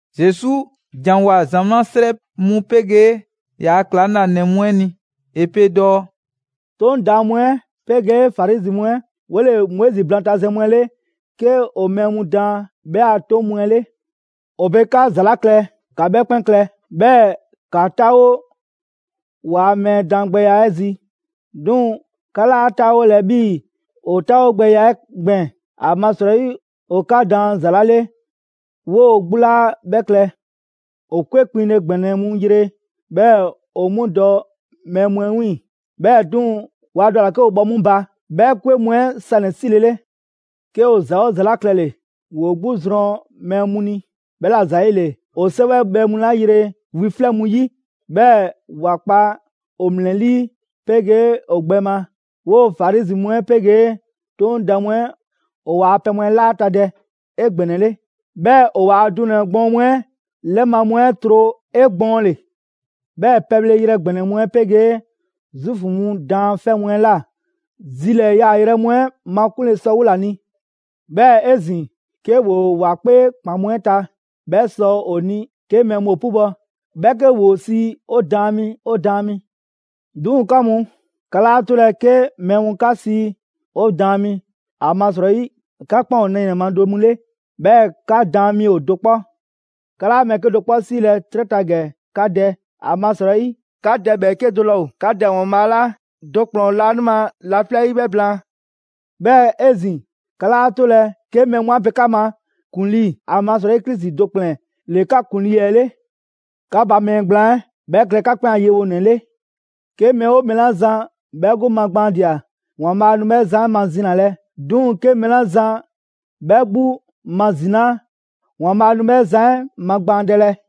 Zesu ‑janwoa ‑zamaa' 'srɛ mu 'pegee ‑yaa' ‑klaŋlanɛ mu 'ɛ ni. ‑E pe dɔɔ: «'Toŋ daan mu 'ɛ 'pegee Farizi mu 'ɛ 'wole‑ Moizi blaantazɛn mu 'ɛ 'le 'ke ‑o mɛɛ mu daan 'bhɛ a 'toŋ mu 'ɛ 'le. ‑O pe 'ka ‑za 'la klɛ, ‑ka 'bhɛ 'kpɛn klɛ, 'bhɛɛ‑ ‑ka 'taawo ‑waa' mɛɛ daangbɛya 'ɛ zi. 'Duŋ‑ 'ka 'laa 'taawolɛ 'bhii‑ ‑o 'taawogbɛya 'ɛ gbɛɛn‑. ‑Amasrɔyi ‑o 'ka daan ‑za 'la 'le 'woo‑ 'gbu 'laa 'bhɛ klɛ. ‑O 'kwe kpiŋle ‑gbɛnɛ mu yre 'bhɛɛ‑ ‑o 'mu dɔ mɛɛ mu 'ɛ 'wiiŋ‑, 'bhɛɛ‑ 'duŋ‑ waa dɔ ‑a ‑la 'ke ‑o bhɔ 'mu ba 'bhɛ 'kwe mu 'ɛ sanɛ‑ 'silele. 'Ke ‑o ‑za 'oo ‑za 'la klɛle‑, ‑woo 'gbu zrɔn mɛɛ mu ni. 'Bhɛla‑ ‑zayile, ‑o 'sɛwɛbhɛ mu 'la yre wi 'flɛ mu 'yi, 'bhɛɛ‑ ‑wa 'kpa ‑o ‑mlɛlii' 'pegee ‑o gbɛ ma, 'woo‑ Farizi mu 'ɛ 'pegee 'Toŋ daan mu 'ɛ ‑o waa pɛ mu 'ɛ 'laata‑ dɛ 'egbɛnɛle, 'bhɛɛ‑ ‑o waa dunɛ‑ gbɔɔn mu 'ɛ 'lɛma‑ mu 'ɛ tro 'egbɔɔnle. 'Bhɛɛ‑ pɛbhleyrɛ ‑gbɛnɛ mu 'ɛ 'pegee Zuufu mu daanfɛ' mu 'ɛ ꞊la zilɛɛ‑ yaayrɛ mu 'ɛ makunle sɔ 'wola‑ ni. 'Bhɛɛ‑ 'ezin‑, 'ke ‑woo ‑wa 'kpee ‑kpan mu 'ɛ ta, 'bhɛ sɔ ‑o ni 'ke mɛɛ mu ‑o 'pubɔ‑, 'bhɛ 'ke ‑woo sii ‹'O daan mi, 'o daan mi›. 'Duŋ‑ 'ka mu, 'ka 'laa 'tolɛ‑ 'ke mɛɛ mu 'ka sii ‹'O daan mi›, ‑amasrɔyi 'ka 'kpɛn ‑o nɛɛnɛ‑ ma do mu 'le, 'bhɛɛ‑ 'ka daan mi ‑o do 'kpɔ. 'Ka 'laa mɛɛ 'kedo‑ 'kpɔ 'siilɛ‑ 'trɛ ta ‑gɛ 'ka dɛ, ‑amasrɔyi 'ka Dɛ ‑bhɛɛke' do 'laa ‑o 'ka Dɛ ‑Waanbhaa' 'la do ‑kplɛn ‑o laanima laflɛ' 'yi 'bhɛ blaan. 'Bhɛɛ‑ 'ezin‑, 'ka 'laa 'tolɛ‑ 'ke mɛɛ mu 'a pe 'ka ma ‹‑kuŋlii›, ‑amasrɔyi Krisi do ‑kplɛn ‑le 'ka ‑kuŋlii 'ɛ 'le. 'Ka ba mɛɛ gblaan 'ɛ, 'bhɛ klɛ 'ka 'kpɛn a yewonɛ 'le. 'Ke mɛɛ 'oo mɛɛ 'la zan 'bhɛ 'gbu magbaandia ‑Waanbhaa' nu 'bhɛ zan 'ɛ mazinalɛ, 'duŋ‑ 'ke mɛɛ 'la zan 'bhɛ 'gbu mazinaa, ‑Waanbhaa' nu 'bhɛ zan 'ɛ magbaandɛlɛ.»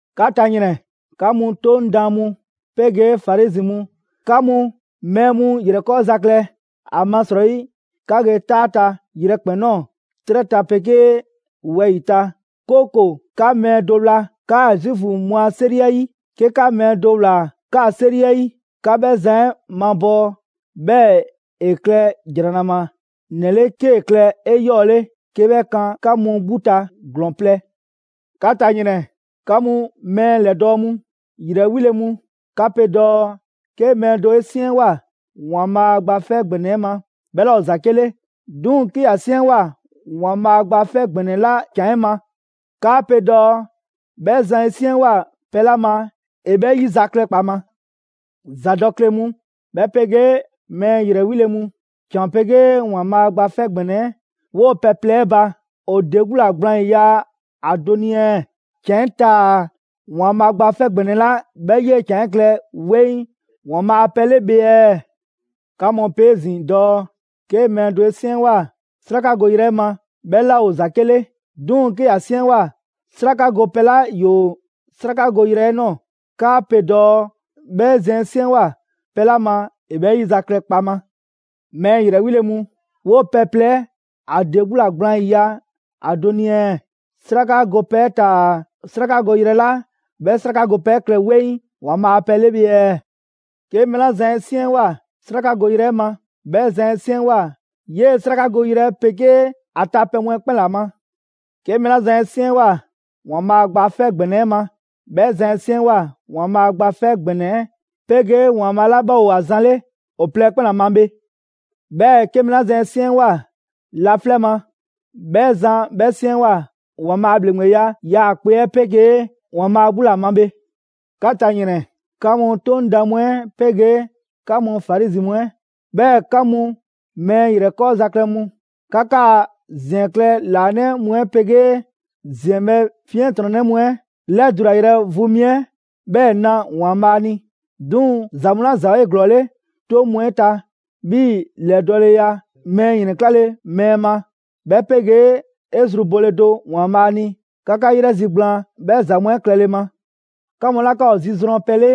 «'Ka ta ‑yrɛn! 'Ka mu 'Toŋ daan mu 'pegee Farizi mu mu, 'ka mu mɛɛ mu ‑yrɛkɔɔza klɛ! ‑Amasrɔyi 'ka ge 'taa ta yrɛkpɛn‑ ꞊nɔɔ 'trɛ ta 'pegee wɛyi‑ ta, 'kooko‑ 'ka mɛɛ do wla 'kaa‑ Zuufu mu a 'seri 'ɛ 'yi. 'Ke 'ka mɛɛ do ꞊wlaa 'kaa‑ 'seri 'ɛ 'yi, 'ka 'bhɛ zan 'ɛ mabɔɔ 'bhɛɛ‑ ‑e klɛ ‑jranama 'nɛ 'le 'kee‑ klɛ 'eyɔɔle 'ke 'bhɛ kan 'ka mu 'gbu ta ‑glɔɔn plɛ.» «'Ka ta ‑yrɛn! 'Ka mu, mɛɛ ‑lɛdɔɔ' mu ‑yrɛ 'wile‑ mu! 'Ka pe dɔɔ: ‹'Ke mɛɛ do 'e 'siɛnwoa‑ ‑Waanbhaa' Gba 'Fɛ ‑Gbɛnɛ 'ɛ ma, 'bhɛ 'laa ‑o ‑zake' 'le; 'duŋ‑ 'ke ‑ya 'siɛnwoa‑ ‑Waanbhaa' Gba 'Fɛ ‑Gbɛnɛ ꞊la ‑can 'ɛ ma, 'kaa‑ pe dɔɔ 'bhɛ zan 'e 'siɛnwoa‑ pɛ 'la ma ‑e 'bhɛ 'yizaklɛ kpaŋma.› ‑Zadɔkle mu, 'bhɛ 'pegee mɛɛ ‑yrɛ 'wile‑ mu! ‑Can 'pegee ‑Waanbhaa' Gba 'Fɛ ‑Gbɛnɛ 'ɛ, 'woo‑ pɛ plɛ 'ɛ ba, ‑o ‑de 'gbu ‑la gblaan ‑yiya' ‑a do ni ɛɛ? ‑Can 'ɛ taa‑ ‑Waanbhaa' Gba 'Fɛ ‑Gbɛnɛ 'la 'bhɛ 'yee‑ ‑can 'ɛ klɛ 'weŋ ‑Waanbhaa' a pɛ 'le bhe ɛɛ? 'Ka mu pe 'ezin‑ dɔɔ 'ke mɛɛ do 'e 'siɛnwoa‑ 'srakagoyrɛ 'ɛ ma, 'bhɛ 'laa ‑o ‑zake' 'le; 'duŋ‑ 'ke ‑ya 'siɛnwoa‑ 'sraka gopɛ 'la ‑yoo 'srakagoyrɛ 'ɛ ꞊nɔɔ, 'kaa‑ pe dɔɔ 'bhɛ zan 'e 'siɛnwoa‑ pɛ 'la ma, ‑e 'bhɛ 'yizaklɛ kpaŋma. Mɛɛ ‑yrɛ 'wile‑ mu, 'woo‑ pɛ plɛ 'ɛ ‑a ‑de 'gbu ‑la gblaan ‑yiya' ‑a do ni ɛɛ? 'Sraka gopɛ 'ɛ taa‑ 'srakagoyrɛ 'la 'bhɛ 'sraka gopɛ 'ɛ klɛ 'weŋ ‑Waanbhaa' a pɛ 'le bhe ɛɛ? 'Ke mɛɛ 'la zan 'e 'siɛnwoa‑ 'srakagoyrɛ 'ɛ ma, 'bhɛ zan 'e 'siɛnwoa‑ 'yee‑ 'srakagoyrɛ 'ɛ 'pegee ‑a ta pɛ mu 'ɛ 'kpɛn ‑la ma; 'ke mɛɛ 'la zan 'e 'siɛnwoa ‑Waanbhaa' Gba 'Fɛ ‑Gbɛnɛ 'ɛ ma, 'bhɛ zan 'e 'siɛnwoa‑ ‑Waanbhaa' Gba 'Fɛ ‑Gbɛnɛ 'ɛ 'pegee ‑Waanbhaa' 'la 'bhɛ ‑o ‑a zan 'le ‑o plɛ ‑kpɛn ‑la ma bhe. 'Bhɛɛ‑ 'ke mɛɛ 'la zan 'e 'siɛnwoa‑ laflɛ' ma, 'bhɛ zan 'bhɛ 'siɛnwoa‑ ‑Waanbhaa' a ‑bhleŋgbeya 'yaakpe‑ 'ɛ 'pegee ‑Waanbhaa' 'gbu ‑la ma bhe.» «'Ka ta ‑yrɛn! 'Ka mu 'Toŋ daan mu 'ɛ 'pegee 'ka mu Farizi mu 'ɛ, 'bhɛɛ‑ 'ka mu mɛɛ ‑yrɛkɔɔza klɛ mu! 'Ka 'kaa‑ ‑ziɛn klɛ ‑laanɛ' mu 'ɛ 'pegee ‑ziɛnbhɛ' 'fiɛntrɔnnɛ mu 'ɛ ‑lɛdulayrɛ vu mi 'ɛ 'bhɛɛ‑ 'na ‑Waanbhaa' ni. 'Duŋ‑ ‑za mu 'la ‑za ‑o 'eglɔɔle 'toŋ mu 'ɛ ta, 'bhii‑ ‑lɛdɔɔleya, mɛɛ ‑yrɛnklale mɛɛ ma, 'bhɛ 'pegee 'e zru bole do ‑Waanbhaa' ni, 'ka 'ka 'yrɛzigblaan 'bhɛ ‑za mu 'ɛ klɛle ma. 'Ka mu 'la 'ka ‑o zi zrɔn pɛ 'le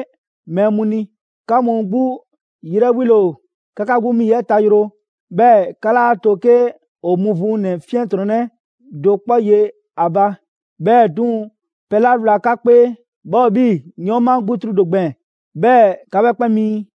mɛɛ mu ni, 'ka mu 'gbu 'yrɛ 'wile‑ ‑o! 'Ka 'ka 'gbu 'mi yi 'ɛ tayroo, 'bhɛɛ‑ 'ka 'laa to 'ke ‑o muvuŋ ‑nɛ 'fiɛntrɔnnɛ do 'kpɔ ye ‑a ba. 'Bhɛɛ‑ 'duŋ‑, pɛ 'la wla 'ka 'kpee 'bhɛ ‑o 'bhii‑ 'yɔɔnma 'gbutru do gbɛɛn‑, 'bhɛɛ‑ 'ka 'bhɛ 'kpɛn miin.»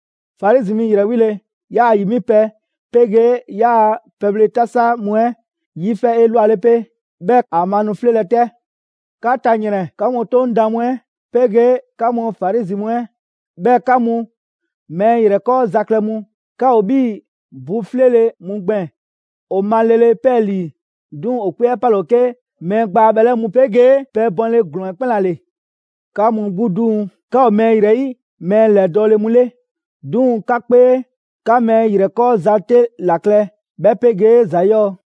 Farizi mi ‑yrɛ 'wile‑! 'Yaa‑ ‑yi 'mipɛ‑ 'pegee 'yaa‑ pɛbhle 'tasa mu 'ɛ 'yifɛ 'elwale 'pe, 'bhɛɛ‑ ‑a ma nu 'fleelɛ‑ 'tɛ.» «'Ka ta ‑yrɛn! 'Ka mu 'Toŋ daan mu 'ɛ 'pegee 'ka mu Farizi mu 'ɛ, 'bhɛɛ‑ 'ka mu mɛɛ ‑yrɛkɔɔza klɛ mu! 'Ka ‑o 'bhii‑ bu 'fleele‑ mu gbɛɛn‑; ‑o ma lele 'pɛɛlii‑, 'duŋ‑ ‑o 'kpee 'ɛ 'pale‑ ‑o 'ke mɛɛ gbaa bhɛlɛ' mu 'pegee pɛ bɔnle ‑glɔɔn 'ɛ 'kpɛn ‑la ‑le. 'Ka mu 'gbu 'duŋ‑, 'ka ‑o mɛɛ ‑yrɛ 'yi mɛɛ ‑lɛdɔɔle mu 'le, 'duŋ‑ 'ka 'kpee, 'ka mɛɛ ‑yrɛkɔɔza 'te ‑la klɛ 'bhɛ 'pegee ‑za 'yɔɔ‑.»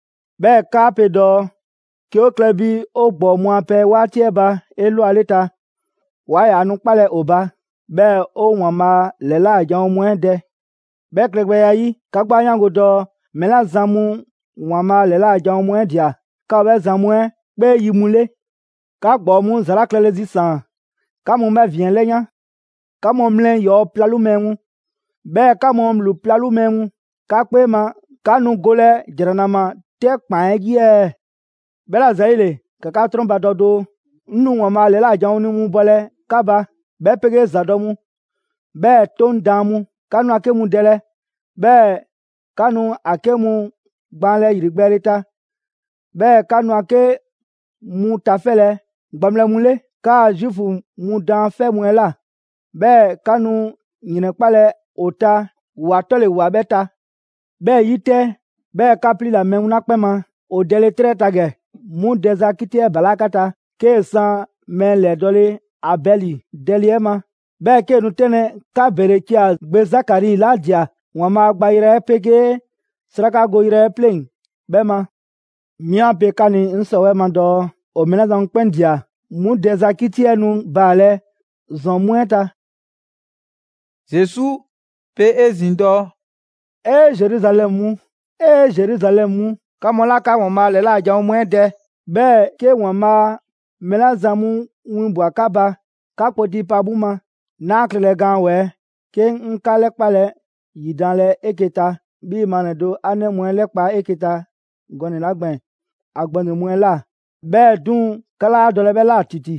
'Bhɛɛ‑ 'kaa pe dɔɔ: ‹'Ke 'o klɛ bi 'o ‑gbɔɔ mu a pɛ 'waati 'ɛ ba 'elwaleta, 'waa ‑yaa nu 'kpalɛ‑ ‑o ba 'bhɛɛ‑ 'o ‑Waanbhaa' ‑lɛla' janwo mu 'ɛ dɛ.› 'Bhɛ klɛgbɛya 'ɛ 'yi, 'ka 'gbu 'a 'yaango‑ dɔɔ mɛɛ 'la zan mu ‑Waanbhaa' ‑lɛla' janwo mu 'ɛ ꞊dia 'ka ‑o 'bhɛ zan mu 'ɛ 'kpee yi mu 'le. 'Ka ‑gbɔɔ mu ‑za 'la klɛle zisaan‑, 'ka mu 'bhɛ ‑vin 'ɛ 'lɛyan. 'Ka mu mlɛ ‑yɔɔ' 'plalu mɛɛ mu, 'bhɛɛ‑ 'ka mu ‑bhlu 'plalu mɛɛ mu, 'ka 'kpee ma 'ka nu golɛ ‑jranama 'tɛ ‑kpan 'ɛ 'yi ɛɛ? 'Bhɛla‑ ‑zayile, ‑ka 'ka 'trɔnbadɔ doo, 'ŋ nu ‑Waanbhaa' ‑lɛla' janwo mu 'winbɔlɛ 'ka ba, 'bhɛ 'pegee ‑zadɔ' mu, 'bhɛɛ‑ 'Toŋ daan mu. 'Ka nu ‑a 'ke mu dɛlɛ, 'bhɛɛ‑ 'ka nu ‑a 'ke mu gbaanlɛ ‑yrigbɛɛle ta. 'Bhɛɛ‑ 'ka nu ‑a 'ke mu tafɛlɛ gbaŋbhlɛ mu 'le 'kaa‑ Zuufu mu daanfɛ' mu 'ɛ ꞊la; 'bhɛɛ‑ 'ka nu ‑yrɛnkpalɛ ‑o ta ‑wa 'tɔle‑ ‑wa 'bhɛ ta. 'Bhɛ 'yi 'tɛ, 'bhɛɛ‑ 'ka 'pliila‑ mɛɛ mu 'la 'kpɛn ma ‑o dɛlele 'trɛ ta ‑gɛ, 'mu dɛza 'kiti 'ɛ balaa' 'ka ta; 'kee‑ san mɛɛ ‑lɛdɔɔle Abɛli dɛle 'ɛ ma, 'bhɛɛ‑ 'kee‑ nu 'tɛnlɛ‑ 'ka Berekia gbe Zakari 'la ꞊dia ‑Waanbhaa' gbayrɛ 'ɛ 'pegee 'srakagoyrɛ 'ɛ 'pleŋ‑ 'bhɛ ma. 'Mi 'a pe 'ka ni 'ŋ 'sɔwɛɛ‑ ma dɔɔ ‑o mɛɛ 'la zan mu 'kpɛn ꞊dia, 'mu dɛza 'kiti 'ɛ nu baalɛ ‑zɔn mu 'ɛ ta.» Zesu pe 'ezin‑ dɔɔ: «'Ee, Zeruzalɛmu mu! 'Ee, Zeruzalɛmu mu! 'Ka mu 'la 'ka ‑Waanbhaa' ‑lɛla' janwo mu 'ɛ dɛ, 'bhɛɛ‑ 'ke ‑Waanbhaa' mɛɛ 'la zan mu 'winbwa‑ 'ka ba, 'ka kpoti pa 'mu ma! 'Naa 'a klɛlɛ gaan ‑wɛɛ' 'ke 'ŋ 'ka 'lɛkpale ‑yidanlɛ 'eke‑ ta 'bhii‑ maa nɛɛ do ‑a ‑nɛ mu 'ɛ 'lɛkpa‑ 'eke‑ ta gɔnɛ‑ 'la gbɛɛn‑ ‑a gbɛŋroŋ‑ mu 'ɛ ꞊la. 'Bhɛɛ‑ 'duŋ‑ 'ka 'laa dɔlɛ 'bhɛ ꞊la ‑titi.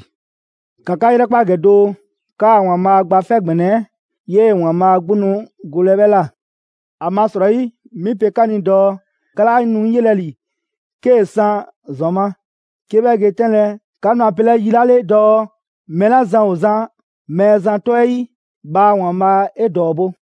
‑Ka 'ka 'yrɛkpa ‑gɛ doo! 'Kaa‑ ‑Waanbhaa' Gba 'Fɛ ‑Gbɛnɛ 'ɛ 'yee‑ ‑Waanbhaa' 'gbu nu golɛ 'bhɛ ꞊la. ‑Amasrɔyi, 'mi pe 'ka ni dɔɔ: 'ka 'laa nu 'ŋ yelɛ ‑li 'kee‑ san ‑zɔn ma, 'ke 'bhɛ ge 'tɛnlɛ‑ 'ka nu ‑a pelɛ yi 'la 'le dɔɔ: ‹Mɛɛ 'la zan ‑o zan Mɛɛzan 'tɔ 'ɛ 'yi, bhaa ‑Waanbhaa' 'e ‑dɔɔbo'!›»